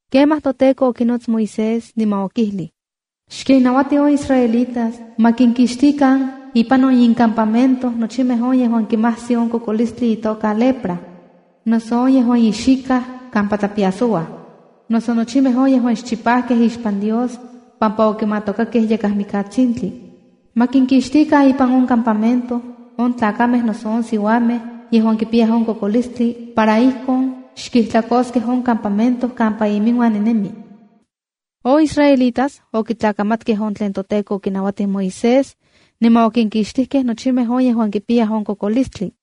Kemaj toTEKO okinots Moisés, niman okijlij: “Xkinnauati on israelitas ma kinkixtikan ipan on incampamento nochimej on yejuan kimajsi on kokolistli itoka lepra, noso on yejuan ixikaj kampa tlapiasouaj, noso nochimej yejuan xchipajkej ixpan Dios pampa okimatokakej yakaj mikatsintli. Ma kinkixtikan ipan on campamento on tlakamej noso siuamej yejuan kipiyaj on kokolistli, para ijkon xkijtlakoskej on campamento kampa iminuan ninemi.” On israelitas okitlakamatkej on tlen toTEKO okinauatij Moisés, niman okinkixtijkej nochimej on yejuan kipiyayaj on kokolistli.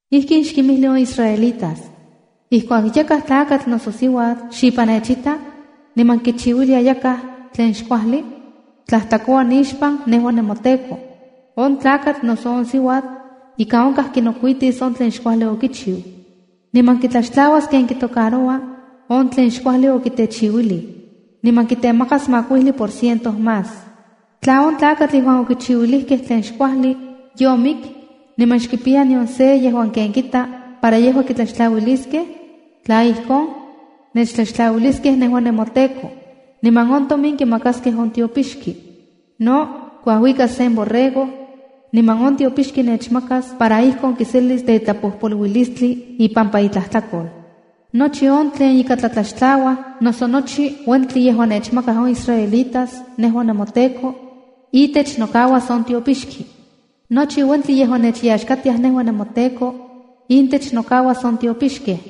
“Ijkin xkinmijli on israelitas: Ijkuak yakaj tlakatl noso siuatl xipan nechita, niman kichiuilia yakaj tlen xkuajli, tlajtlakoua nixpan nejua nemoTEKO. On tlakatl noso on siuatl ika onkaj kinokuitis on tlen xkuajli okichiu, niman kitlaxtlauas ken kitocaroua on tlen xkuajli okitechiuilij, niman kitemakas makuijli por ciento más. Tla on tlakatl yejuan okichiuilijkej tlen xkuajli yomik niman xkipiya nion se yejuan ken kita para yejua kitlaxtlauiliskej, tla ijkon, nechtlaxtlauiliskej nejua nemoTEKO niman on tomin kimakaskej on tiopixki. No kuajuikas sen borrego, niman on tiopixki nechmakas para ijkon kiselis tetlapojpoluilistli ipampa itlajtlakol. ’Nochi on tlen ika tlatlaxtlauaj noso nochi uentli yejuan nechmakaj on israelitas nejua nemoTEKO, itech nokauas on tiopixki. Nochi uentli yejuan nechyaxkatiaj nejua nemoTEKO, intech nokauas on tiopixkej.”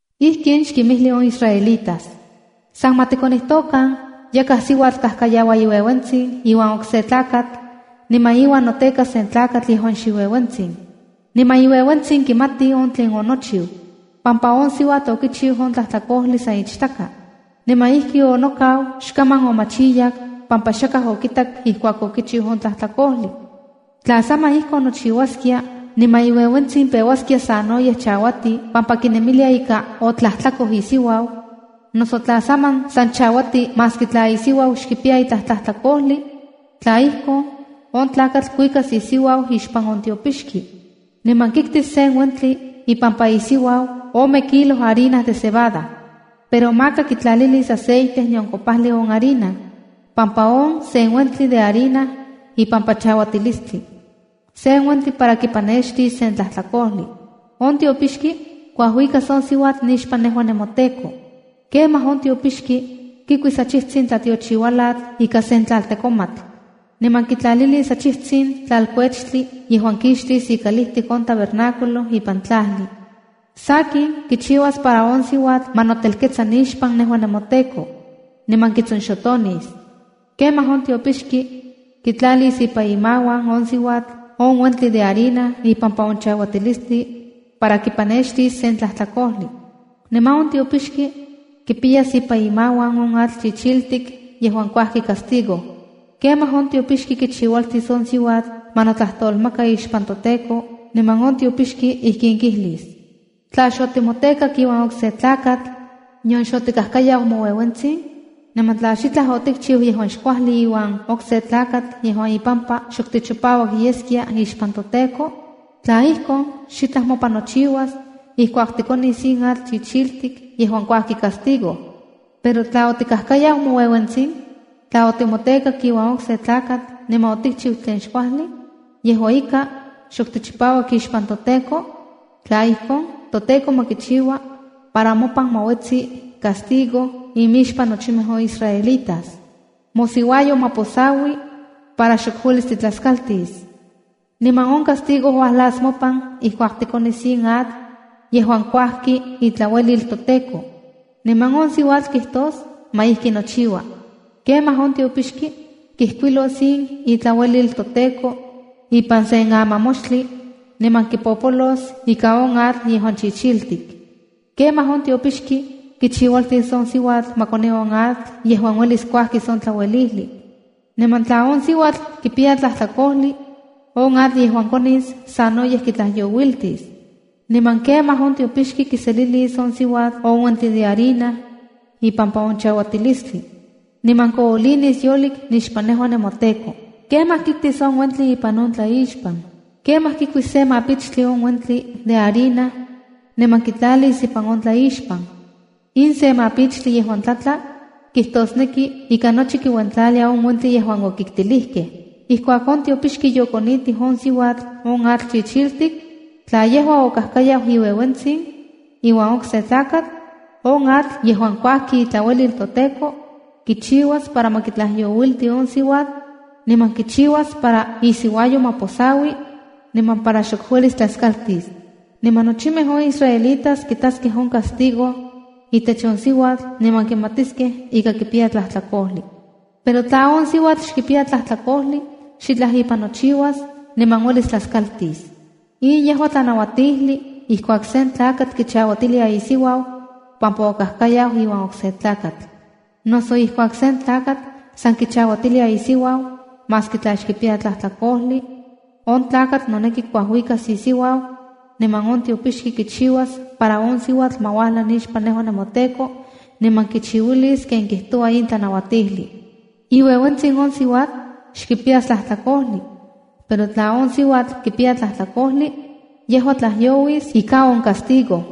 “Ijkin xkinmijli on israelitas: “ San ma tikonijtokan yakaj siuatl kajkayaua iueuentsin iuan okse tlakatl, niman iuan noteka sen tlakatl yejuan xiueuentsin. Niman iueuentsin xkimati on tlen onochiu, pampa on siuatl okichiu on tlajtlakojli san ichtaka, niman ijki onokau xkaman omachiyak pampa xakaj okitak ijkuak okichiu on tlajtlakojli. Tla saman ijkon nochiuaskia niman iueuentsin peuaskia sanoyej chauati pampa kinemilia ika otlajtlakoj isiuau, noso tla saman san chauati maski tla isiuau xkipiya itlaj tlajtlakojli, tla ijkon, on tlakatl kuikas isiuau ixpan on tiopixki. Niman kiktis sen uentli ipampa isiuau ome kilo harina de cebada. Pero maka kitlalilis aceite nion kopajli on harina, pampa on sen uentli de harina ipampa chauatilistli, sen uentli para kipanextis sen tlajtlakojli. ’On tiopixki kuajuikas on siuatl nixpan nejua nemoTEKO. Kemaj on tiopixki kikuis achijtsin tlatiochiualatl ika sen tlaltekomatl, niman kitlalilis achijtsin tlalkuechtli yejuan kixtis ikalijtik on tabernáculo ipan tlajli. Sakin, kichiuas para on siuatl ma notelketsa nixpan nejua nemoTEKO, niman kitsonxotonis. Kemaj on tiopixki kitlalis ipan imauan on siuatl on uentli de harina ipampa on chauatilistli para kipanextis sen tlajtlakojli. Niman on tiopixki kipiyas ipan imauan on atl chichik yejuan kuajki castigo. Kemaj on tiopixki kichiualtis on siuatl ma notlajtolmaka ixpan toTEKO niman on tiopixki ijkin kijlis: ‘Tla xotimotekak iuan okse tlakatl, nion xotikajkayau moueuentsin, niman tla xitlaj otikchiu yejuan xkuajli iuan okse tlakatl yejuan ipampa xok tichopauak yeskia ixpan toTEKO, tla ijkon, xitlaj mopan nochiuas ijkuak tikonis in atl chichik yejuan kuajki castigo. Pero tla otikajkayau moueuentsin, tla otimotekak iuan okse tlakatl niman otikchiu tlen xkuajli, yejua ika xok tichipauak ixpan toTEKO, tla ijkon, ToTEKO ma kichiua para mopan ma uetsi castigo imixpan nochimej on israelitas. Mosiuayo ma posaui para xok uelis titlaskaltis. Niman on castigo uajlas mopan, ijkuak tikonis in atl yejuan kuajki itlauelil toTEKO.” Niman on siuatl kijtos: “Ma ijki nochiua.” ’Kemaj on tiopixki kijkuilos in itlauelil toTEKO ipan sen amamoxtli niman kipopolos ika on atl yejuan chichik. Kemaj on tiopixki kichiualtis on siuatl ma koni on atl yejuan uelis kuajkis on tlauelijli, niman tla on siuatl kipiya tlajtlakojli, on atl yejuan konis sanoyej kitlajyouiltis. Niman kemaj on tiopixki kiselilis on siuatl on uentli de harina ipampa on chauatilistli, niman koolinis yolik nixpan nejua nemoTEKO. Kemaj kiktis on uentli ipan on tlaixpan. Kemaj kikuis se mapichtli on uentli de harina niman kitlatis ipan on tlaixpan. In se mapichtli yejuan tlatla, kijtosneki ika nochi kiuentlalia on uentli yejuan okiktilijkej. ’Ijkuak on tiopixki yokonitij on siuatl on atl chichik, tla yejua okajkayau iueuentsin iuan okse tlakatl, on atl yejuan kuajki itlauelil toTEKO, kichiuas para ma kitlajyouilti on siuatl niman kichiuas para isiuayo ma posaui niman para xok uelis tlaskaltis. Niman nochimej on israelitas kitaskej on castigo itech on siuatl niman kimatiskej ika kipiya tlajtlakojli. Pero tla on siuatl xkipiya tlajtlakojli, xitlaj ipan nochiuas niman uelis tlaskaltis. ’In yejua tlanauatijli: Ijkuak sen tlakatl kichauatilia isiuau pampa okajkayau iuan okse tlakatl, noso ijkuak sen tlakatl san kichauatilia isiuau maski tla xkipiya tlajtlakojli, on tlakatl noneki kuajuikas isiuau, niman on tiopixki kichiuas para on siuatl ma uajla nixpan nejua nemoTEKO, niman kichiuilis ken kijtoua in tlanauatijli. Iueuentsin on siuatl xkipiyas tlajtlakojli, pero tla on siuatl kipiya tlajtlakojli, yejua tlajyouis ika on castigo.”